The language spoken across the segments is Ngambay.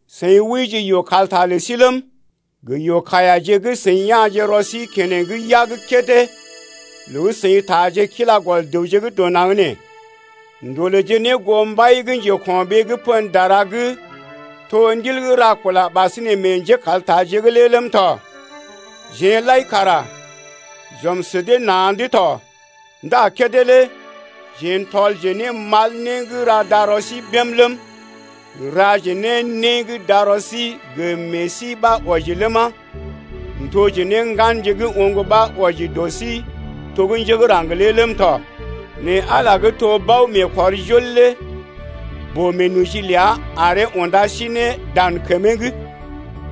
Seḭ wəije yoo-kalta lə sí ləm gə yoo-kaiyaje gə́ seḭ ya̰je rɔ sí keneŋ yag kédé loo gə́ seḭ taaje kila gɔl dəwje gə́ dɔ naŋg nee, ndolèje ne goo mbai gə́ njeko̰ɓee gə́ pən dara gə́ to ndil gə́ ra kula ɓasinè meḛ njékaltaje’g lé ləm tɔ. Jeḛ lai kara j’ɔm sə dee na̰’d tɔ ndá kédé lé jeḛ n’tɔlje ne mal né gə́ ra darɔ sí bém ləm, n’raje ne né gə́ darɔ sí gə meḛ sí ɓa wɔji ləma, n’toje ne ŋganje gə́ oŋg ɓa wɔji dɔ sí to gə́ njé gə́ raŋg lé ləm tɔ. Nɛ Ala gə́ to bao-meekɔrjol lé boo-meenoji ləa aree unda sí ne dan kəmee’g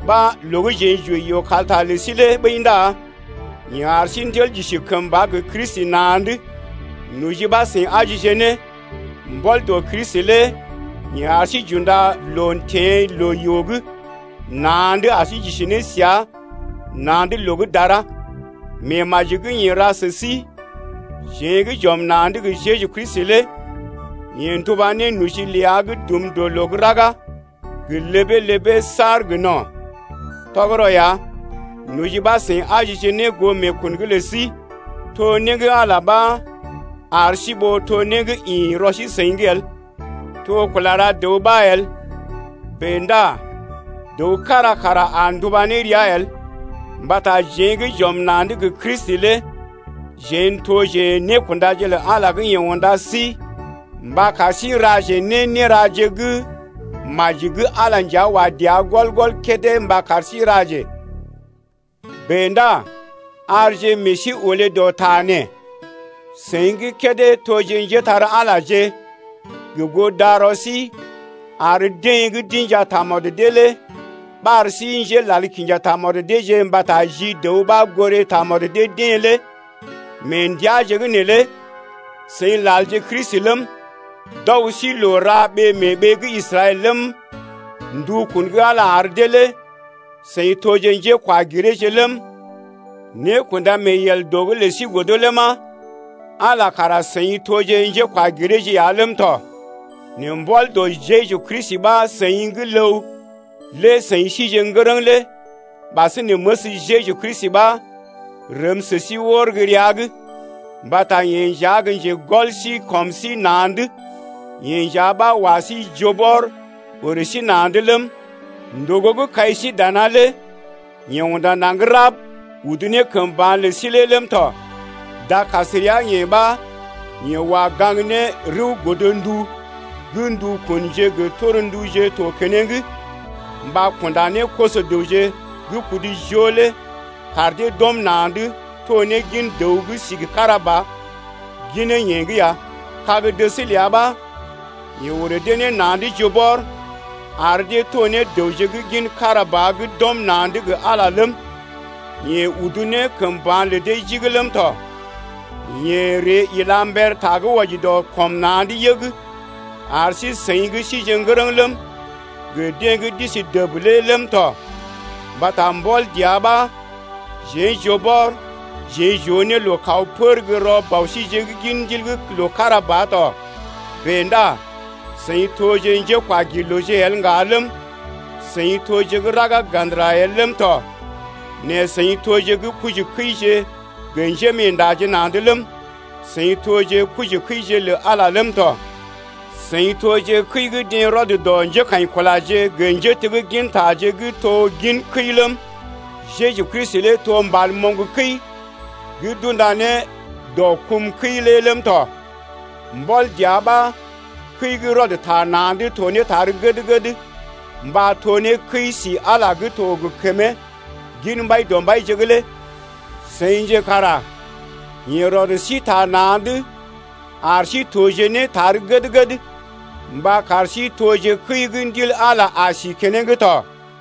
ɓa loo gə́ jeḛ j’wəi yoo-kalta lə sí lé ɓəi ndá yeḛ ar sí n’tel j’isi kəmba gə Kristi na̰’d (noji ɓa seḭ ajije ne.) Mbɔl dɔ Kristi lé yeḛ ar sí j’unda loo teḛ loo-yoo’g na̰’d ar sí j’isi ne səa na̰’d loo gə́ dara. Meemaji gə́ yeḛ ra sə síjeḛ gə́ j’ɔm na̰’d gə Jeju Kristi lé yeḛ nduba ne noji ləa gə́ dum dɔ loo gə́ raga, gə ləbee-ləbee saar gə no̰. Tɔgərɔ ya, noji ɓa seḭ ajije ne goo meekun’g lə sí. To né gə́ Ala ɓa ar sí ɓó to né gə́ ḭ rɔ sí-seḭ’g el. To kula ra dəw ɓa el, bèe ndá dəw kára kara a nduba ne rəa el. Mbata jeḛ gə́ j’ɔm na̰’d gə Kristi lé jeḛ n’toje nékundaje lə Ala gə́ yeḛ unda sí mba kar sí n’ra ne néraje gə́ maji gə́ Ala nja wa dəa gɔl-gɔl kédé mba kar sí n’raje. Bèe ndá arje meḛ sí olé dɔ ta nee: Seḭ gə́ kédé toje njépole-magəje gə goo darɔ sí ar deḛ gə́ d’inja tamɔd dee lé ɓar sí njélal kinja tamɔd deeje mbata ji dəw ɓa goré tamɔd dee-deḛ lé mee ndəaje’g neelé seḭ lalje Kristi ləm, d’ɔg sí loo ra ɓee mee ɓee gə́ Israɛl ləm, ndukun gə́ Ala ar dee lé seḭ toje njékwagireeje ləm, nékunda-mee-yel dɔ’g lə sí godo ləma, Ala kara seḭ toje njékwagireeje ya ləm tɔ. Nɛ mbɔl dɔ Jeju Kristi ɓa seḭ gə́ ləw lé seḭ sije ne ŋgərəŋ lé ɓasinè məs Jeju Kristi ɓa rəm sə sí wər gə́ rəa’g. Mbata yeḛ nja gə́ njegɔl sí kɔm sí na̰’d, yeḛ nja ɓa wa sí joo bɔr orè sí na̰’d ləm, ndògo gə́ kai sí dana lé yeḛ unda naŋg rab, udu ne kəm ba̰ lə sí lé ləm tɔ. Dakasrea-yeḛ ɓa yeḛ wa gaŋg ne rəw godndu gə́ ndukunje gə tornduje tɔ keneŋ mba kunda ne koso-dəwje gə́ kudu joo lé kar dee d’ɔm na̰’d to ne gin dəw gə́ sigi kára ba ginee-yeḛ’g ya. Kag-dəs ləa ɓa yeḛ orè dee ne na̰’d joo bɔr ar dee to ne dəwje gə́ gin kára ba gə́ d’ɔm na̰’d gə Ala lé ləm, yeḛ udu ne kəm ba̰ lə dee jigi ləm tɔ. Yeḛ ree ila mber ta gə́ wɔji dɔ kɔm na̰’d yəg ar sí-seḭ gə́ sije ŋgərəŋ ləm, gə deḛ gə́ d’isi dəb lé ləm tɔ. Mbata mbɔl dəa ɓa jeḛ joo bɔr jeḛ j’oo ne loo kaw pər gə́ rɔ Bɔ síje’g gin Ndil’g loo kára ba tɔ. Bèe ndá seḭ toje njékwagirlooje el ŋga ləm, seḭ toje gə́ raga ga̰dəra el ləm tɔ. Nɛ seḭ toje gə́ kojikəije gə njémeendaje na̰’d ləm, seḭ toje kojikəije lə Ala ləm tɔ. Seḭ toje kəi gə́ deḛ rɔd dɔ njékaḭkulaje gə njéteggintaje gə́ to gin kəi ləm, Jeju Kristi lé to mbal gə́ moŋg kəi gə́ d’unda ne dɔ kum kəi lé ləm tɔ. Mbɔl dəa ɓa kəi gə́ rɔd ta na̰’d to ne tar gəd-gəd mba to ne kəi-si Ala gə́ to gə kəmee gin Mbaidɔmbaije’g lé. Seḭje kara yeḛ rɔd sí ta na̰’d ar sí toje ne tar gəd-gəd mba kar sí toje kəi gə́ Ndil Ala a si keneŋ tɔ.